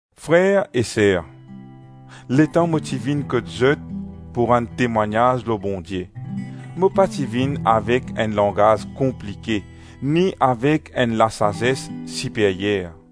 Frer e Ser, letan mo ti vinn kot zot pou rann temwagnaz lor Bondie, mo pa ti vinn avek enn langaz konplike ni avek enn lasazes siperyer.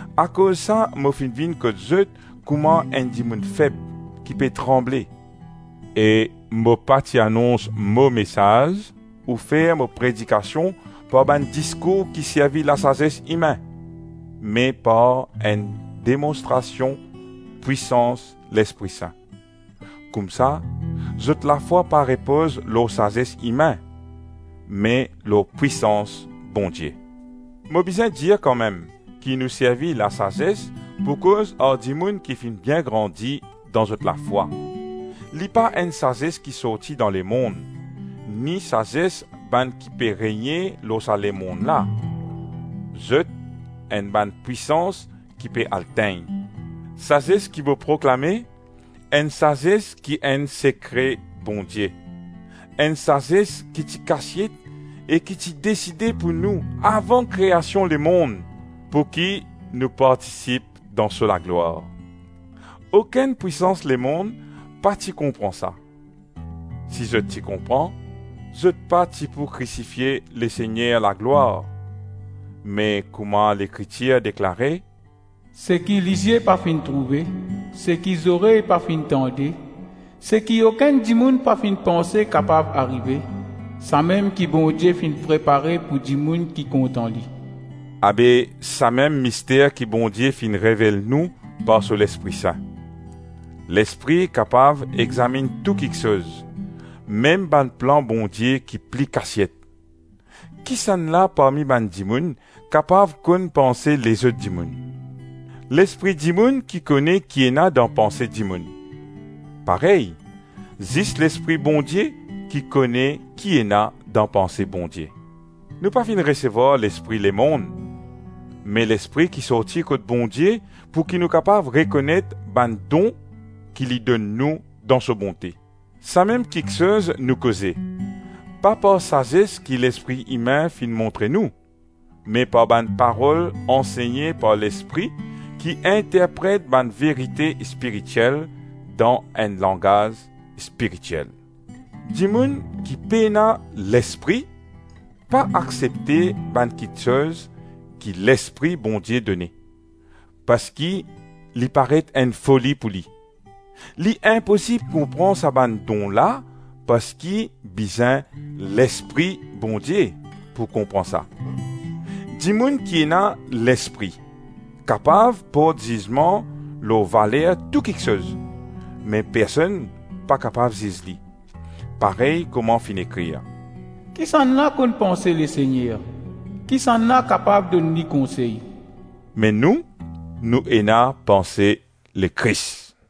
Akoz sa mo finn vinn kot zot kouma enn dimoun feb, ki pe tranble. E mo pa ti anons mo mesaz ou fer mo predikasion par bann diskour ki servi lasazes imin, me par enn demonstrasion pwisans Lespri Sin. Koumsa, zot lafwa pa repoz lor sazes imin me lor pwisans Bondie. Mo bizin dir kanmem, ki nou servi lasazes pou koz ar dimoun ki finn bien grandi dan zot lafwa. Li pa enn sazes ki sorti dan lemonn, ni sazes bann ki pe regne lor sa lemonn la, zot enn bann pwisans ki pe al tegn. Sazes ki mo proklame, enn sazes ki enn sekre Bondie, enn sazes ki ti kasiet e ki ti deside pou nou avan kreasion lemonn pouki nou partisip dan so laglwar. Okenn pwisans lemonn pa ti konpran sa. Si zot ti konpran, zot pa ti pou krisifie Lesegner laglwar. Me kouma Lekritir deklare, “Seki lizie pa finn trouve, seki zorey pa finn tande, seki okenn dimoun pa finn panse kapav arive, samem ki Bondie finn prepare pou dimoun ki kontan li.” Abe, samem mister ki Bondie finn revel nou par so Lespri Sin. Lespri kapav examinn tou kiksoz, mem bann plan Bondie ki pli kasiet. Kisannla parmi bann dimoun kapav konn panse lezot dimoun? Lespri dimoun ki kone ki ena dan panse dimoun. Parey, zis Lespri Bondie ki kone ki ena dan panse Bondie. Nou pa finn resevwar lespri lemonn, me Lespri ki sorti kot Bondie pouki nou kapav rekonet bann don ki li donn nou dan so bonte. Samem kiksoz nou koze, pa par sazes ki lespri imin finn montre nou, me par bann parol ansegne par Lespri ki interpret bann verite spiritiel dan enn langaz spiritiel. Dimoun ki pena Lespri pa aksepte bann kiksoz ki Lespri Bondie done, parski li paret enn foli pou li. Li inposib konpran sa bann don la parski bizin Lespri Bondie pou konpran sa. Dimoun ki ena Lespri kapav port zizman lor valer tou kiksoz, me personn pa kapav ziz li. Parey kouma finn ekrir, “Kisannla konn panse Lesegner? Kisannla kapav donn li konsey?” Me nou, nou ena panse Lekris.